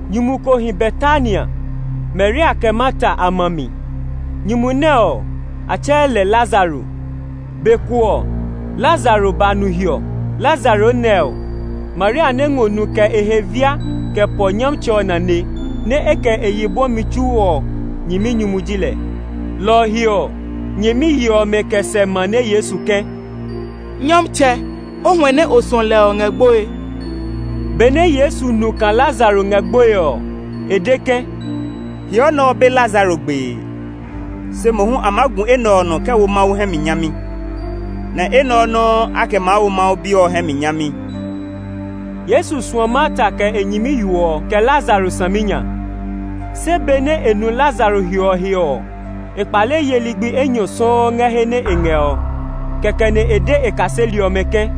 Nyumu ko hi Betania, Maria kɛ Marta a ma a mi. Nyumu nɛ ɔ, a tsɛɛ lɛ Lazaro. Be ko ɔ, Lazaro ba nu hiɔ. Lazaro nɛ ɔ, Maria nɛ ngɔ nu kɛ e he via kɛ pɔ Nyɔmtsɛ ɔ nane, nɛ e kɛ e yi bwɔmi tsu ɔ nyɛminyumu ji lɛ. Lɔ ɔ he ɔ, nyɛmiyi ɔmɛ kɛ sɛ mane Yesu ke, “Nyɔmtsɛ, o huɛ nɛ o suɔ lɛ ɔ ngɛ gboe.” Benɛ Yesu nu kaa Lazaro ngɛ gboe ɔ, e de ke, “Hiɔ nɛ ɔ be Lazaro gbee, se mohu a maa gu enɛ ɔ nɔ kɛ wo Mawu hɛ mi nyami; nɛ enɛ ɔ nɔuu a kɛ maa wo Mawu Bi ɔ hɛ mi nyami.” Yesu suɔ Marta kɛ e nyɛmiyo ɔ, kɛ Lazaro saminya. Se benɛ e nu Lazaro hiɔ he ɔ, e kpale ye ligbi enyɔ sɔuu ngɛ he nɛ e ngɛ ɔ. Kɛkɛ nɛ e de e kaseli ɔmɛ ke,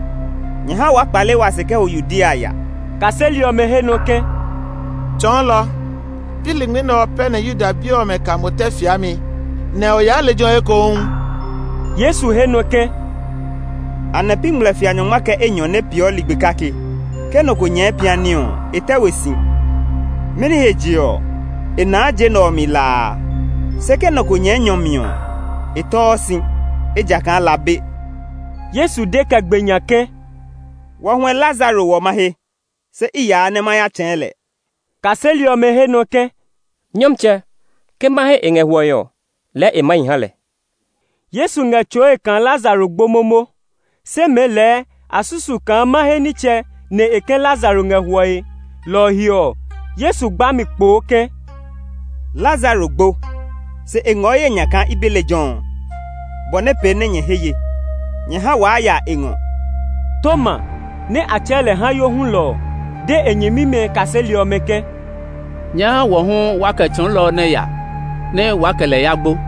“Nyɛ ha waa kpale wa se kɛ ho Yudea ya.” Kaseli ɔmɛ he nɔ ke, “Tsɔɔlɔ, pi lingmi pɛ nɛ Yuda bi ɔmɛ ka mo tɛ fiami, nɛ o yaa lejɛ ɔ ekohu?” Yesu he nɔ ke, “Anɛ pi ngmlɛfia nyɔngma kɛ enyɔ nɛ peeɔ ligbi kake? Ke nɔ ko nyɛɛ piani ɔ, e tɛ we si, mɛni he je ɔ, e naa je nɛ ɔ mi la a. Se ke nɔ ko nyɛɛ nyɔ mi ɔ, e tɛɔ si, ejakaa la be.” Yesu de kɛ gbe nya ke, “Wa huɛ Lazaro hwɔ mahe, se i yaa nɛ ma ya tsɛ̃ɛ̃ lɛ.” Kaseli ɔmɛ he nɔ ke, “Nyɔmtsɛ, ke mahe e ngɛ hwɔe ɔ, lɛɛ e maa hi ha lɛ.” Yesu ngɛ tsɔɔe kaa Lazaro gbo momo, se mɛɛ lɛɛ a susu kaa mahe nitsɛ nɛ e ke Lazaro ngɛ hwɔe. Lɔ ɔ he ɔ, Yesu de mɛ kpoo ke, “Lazaro gbo, se e ngɔ ye nya kaa i be lejɛ ɔ, bɔ nɛ pee nɛ nyɛ he ye. Nyɛ ha waa ya e ngɔ.” Toma nɛ a tsɛɛ lɛ Hayo hulɔ ɔ, de e nyɛmimɛ kaseli ɔmɛ ke, “Nyɛ ha wɔ hu waa kɛ Tsɔɔlɔ ɔ nɛ ya, nɛ waa kɛ lɛ ya gbo.”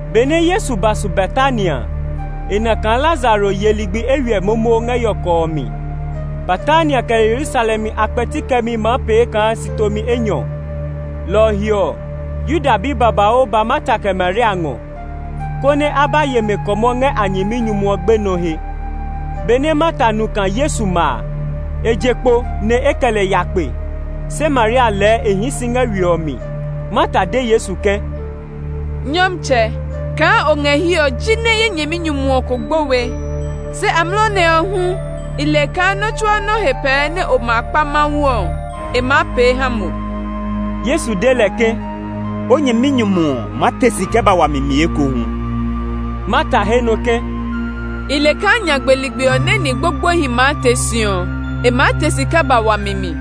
Benɛ Yesu ba su Betania a, e na kaa Lazaro ye ligbi eywiɛ momo ngɛ yɔkɔ ɔ mi. Betania kɛ Yerusalem a kpɛti kɛmi maa pee kaa si tomi enyɔ; lɔ ɔ he ɔ, Yuda bi babauu ba Marta kɛ Maria a ngɔ, konɛ a ba ye mɛ kɔmɔ ngɛ a nyɛminyumu ɔ gbenɔ ɔ he. Benɛ Marta nu kaa Yesu ma a, e je kpo nɛ e kɛ lɛ ya kpe, se Maria lɛɛ e hii si ngɛ we ɔ mi. Marta de Yesu ke, “Nyɔmtsɛ, kaa o ngɛ hiɛ ɔ jinɛ ye nyɛminyumu ɔ ko gbo we. Se amlɔ nɛ ɔ hu, i le kaa nɔ́ tsuaa nɔ́ he pɛɛ nɛ o ma kpa Mawu ɔ, e maa pee ha mo.” Yesu de lɛ ke, “O nyɛminyumu ɔ maa te si kɛ ba wami mi ekohu.” Marta he nɔ ke, “I le kaa nyagbe ligbi ɔ nɛ ni gbogboehi maa te si ɔ, e maa te si kɛ ba wami mi.”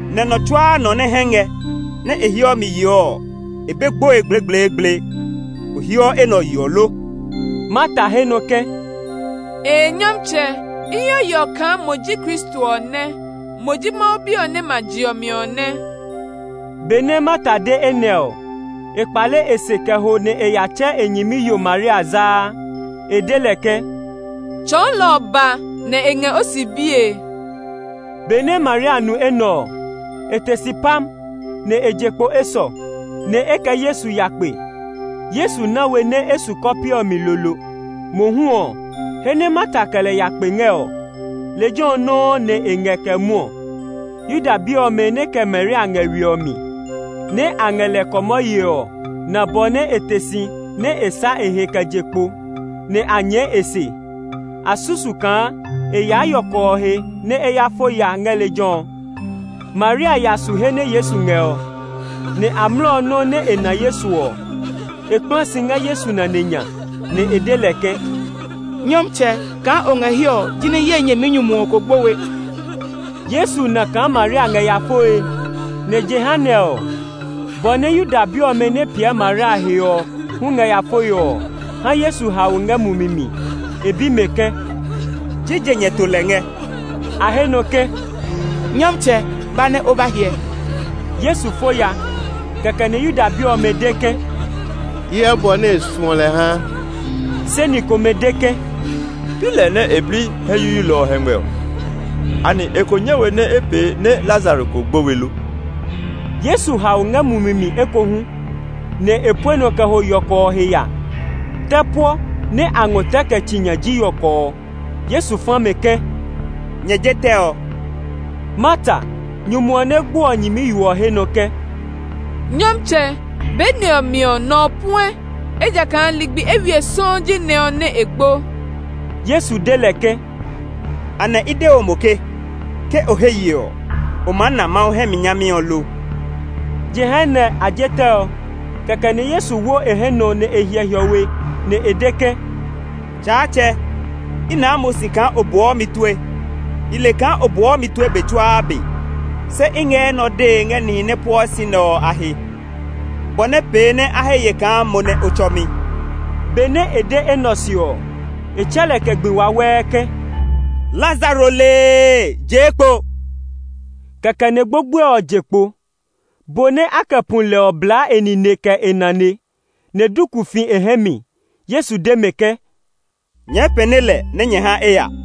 nɛ nɔ tsuaa nɔ nɛ hɛ ngɛ, nɛ e heɔ mi yeɔ ɔ, e be gboe gblegbleegble. O heɔ enɛ ɔ yeɔ lo?” Marta he nɔ ke, “Ee Nyɔmtsɛ, i heɔ yeɔ kaa mo ji Kristo ɔ nɛ! Mo ji Mawu Bi ɔ nɛ ma je ɔ mi ɔ nɛ.” Benɛ Marta de enɛ ɔ, e kpale e se kɛ ho nɛ e ya tsɛ e nyɛmiyo Maria zaa. E de lɛ ke, “Tsɔɔlɔ ɔ ba, nɛ e ngɛ o si bie.” Benɛ Maria nu enɛ ɔ, e te si pam, nɛ e je kpo esɔ, nɛ e kɛ Yesu ya kpe. Yesu na we nɛ e su kɔpe ɔ mi lolo; mohu ɔ, he nɛ Marta kɛ lɛ ya kpe ngɛ ɔ, lejɛ ɔ nɔuu nɛ e ngɛ kɛ mwɔɔ. Yuda bi ɔmɛ nɛ kɛ Maria ngɛ we ɔ mi, nɛ a ngɛ lɛ kɔmɔ yee ɔ na bɔ nɛ e te si nɛ e sá e he kɛ je kpo, nɛ a nyɛɛ e se. A susu kaa e yaa yɔkɔ ɔ he nɛ e ya fo ya ngɛ lejɛ ɔ. Maria ya su he nɛ Yesu ngɛ ɔ, nɛ amlɔ nɔuu nɛ e na Yesu ɔ, e kpla si ngɛ Yesu nane nya, nɛ e de lɛ ke, “Nyɔmtsɛ, kaa o ngɛ hiɛ ɔ jinɛ ye nyɛminyumu ɔ ko gbo we.” Yesu na kaa Maria ngɛ ya foe; nɛ jehanɛ ɔ, bɔ nɛ Yuda bi ɔmɛ nɛ piɛ Maria he ɔ hu ngɛ ya foe ɔ ha Yesu hao ngɛ mumi mi. E bi mɛ ke, “Jije nyɛ to lɛ ngɛ?” A he nɔ ke, “Nyɔmtsɛ, ba nɛ o ba hyɛ.” Yesu fo ya. Kɛkɛ nɛ Yuda bi ɔmɛ de ke, “Hyɛ bɔ nɛ e suɔ lɛ ha!” Se ni komɛ de ke, “Pi lɛ nɛ e bli hɛ yuyuilɔ ɔ hɛngmɛ ɔ! Anɛ e ko nyɛ we nɛ e pee nɛ Lazaro kó gbo we lo?” Yesu hao ngɛ mumi mi ekohu, nɛ e pue nɔ kɛ ho yɔkɔ ɔ he ya. Tɛ puɔ nɛ a ngɔ tɛ kɛ tsi nya ji yɔkɔ ɔ. Yesu fa mɛ ke, “Nyɛ je tɛ ɔ.” Marta, nyumu ɔ nɛ gbo ɔ nyɛmiyo ɔ he nɔ ke, “Nyɔmtsɛ, be nɛ ɔ mi ɔ, nɔ ɔ puɛ, ejakaa ligbi eywiɛ sɔuu ji nɛ ɔ nɛ e gbo.” Yesu de lɛ ke, “Anɛ i de we mo ke, ke o he ye ɔ, o maa na Mawu hɛ mi nyami ɔ lo?” Jehanɛ a je tɛ ɔ; kɛkɛ nɛ Yesu wo e hɛ nɔ nɛ e hyɛ hiɔwe, nɛ e de ke, “Tsaatsɛ, i naa mo si kaa o buɔ mi tue. I le kaa o buɔ mi tue be tsuaa be; se i ngɛ enɛ ɔ dee ngɛ nihi nɛ pueɔ si nɛ ɔ a he, bɔ nɛ pee nɛ a he ye kaa mo nɛ o tsɔ mi.” Benɛ e de enɛ ɔ se ɔ, e tsɛ lɛ kɛ gbi wawɛɛ ke, “Lazaro lee-ee, jee kpo!” Kɛkɛ nɛ gbogboe ɔ je kpo. Bo nɛ a kɛ pu lɛ ɔ blaa e nine kɛ e nane, nɛ duku fi e hɛ mi. Yesu de mɛ ke, “Nyɛɛ pɛne lɛ nɛ nyɛ ha e ya.”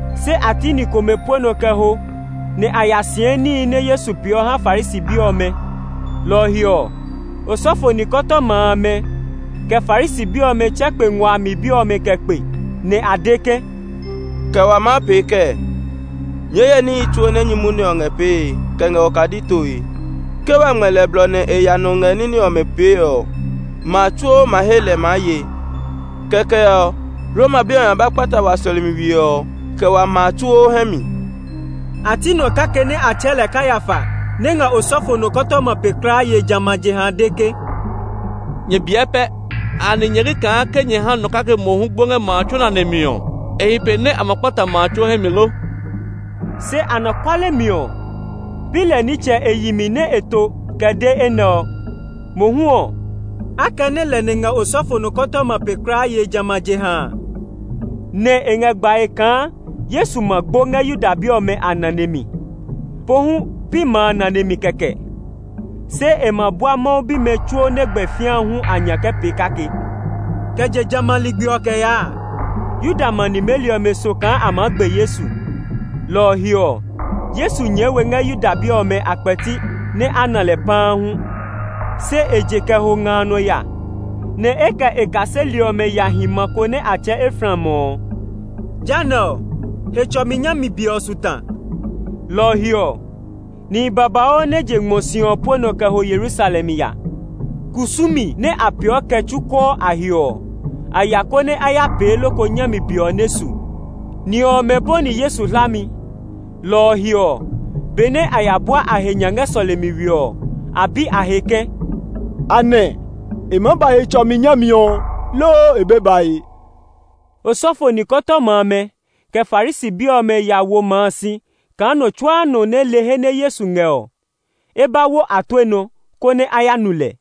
Se a ti ni komɛ pue nɔ kɛ ho nɛ a ya sɛɛ níhi nɛ Yesu pee ɔ ha Farisi bi ɔmɛ. Lɔ ɔ he ɔ, osɔfo nikɔtɔma amɛ, kɛ Farisi bi ɔmɛ tsɛ kpe ngua a mi bi ɔmɛ kɛ kpe, nɛ a de ke, “Kɛ wa maa pee kɛɛ? Nyɛɛ hyɛ níhi tsuo nɛ nyumu nɛ ɔ ngɛ pee kɛ ngɛ okadi toe. Ke wa ngmɛ lɛ blɔ nɛ e ya nɔ ngɛ ní nɛ ɔmɛ pee ɔ, ma a tsuo ma he lɛ maa ye. Kɛkɛ ɔ, Roma bi ɔmɛ maa ba ba kpata wa sɔlemi we ɔ, kɛ wa ma a tsuo hɛ mi.” A ti nɔ kake nɛ a tsɛɛ lɛ Kayafa, nɛ ngɛ osɔfo nɔkɔtɔma pe kulaa yee jamɛ a jeha a de ke, “Nyɛ biɛ pɛ! Anɛ nyɛ li kaa ke nyɛ ha nɔ kake mohu gbo ngɛ ma a tsuo nane mi ɔ, e hi pe nɛ a ma kpata ma a tsuo hɛ mi lo?” Se anɔkuale mi ɔ, pi lɛ nitsɛ e yi mi nɛ e to kɛ de enɛ ɔ. Mohu ɔ, akɛnɛ lɛ nɛ ngɛ osɔfo nɔkɔtɔma pe kulaa yee jamɛ a jeha a nɛ e ngɛ gbae kaa Yesu ma gbo ngɛ Yuda bi ɔmɛ a nane mi. Pohu pi ma a nane mi kɛkɛ, se e ma bua Mawu bimɛ tsuo nɛ gbɛ fĩa hu a nya kɛ pee kake. Kɛ je jamɛ a ligbi ɔ kɛ yaa a, Yuda ma nimeli ɔmɛ so kaa a maa gbe Yesu. Lɔ ɔ he ɔ, Yesu nyɛɛ we ngɛ Yuda bi ɔmɛ a kpɛti nɛ a na lɛ paa hu. Se e je kɛ ho nga a nɔ ya, nɛ e kɛ e kaseli ɔmɛ ya hi ma ko nɛ a tsɛɛ Efraim ɔ. Jehanɛ ɔ, Hetsɔmi nyami be ɔ su ta; lɔ ɔ he ɔ, nihi babauu nɛ je ngmɔ si ɔ pue nɔ kɛ ho Yerusalem ya. Kusumi nɛ a peeɔ kɛ tsukɔɔ a he ɔ, a ya konɛ a ya pee loko nyami be ɔ nɛ su. Ni ɔmɛ bɔni Yesu hlami, lɔ ɔ he ɔ, benɛ a ya bua a he nya ngɛ sɔlemi we ɔ, a bi a he ke, “Anɛ e maa ba Hetsɔmi nyami ɔ, loo e be bae?” Osɔfo nikɔtɔma amɛ, kɛ Farisi bi ɔmɛ ya wo ma a si kaa nɔ tsuaa nɔ nɛ le he nɛ Yesu ngɛ ɔ, e ba wo a tue nɔ, konɛ a ya nu lɛ.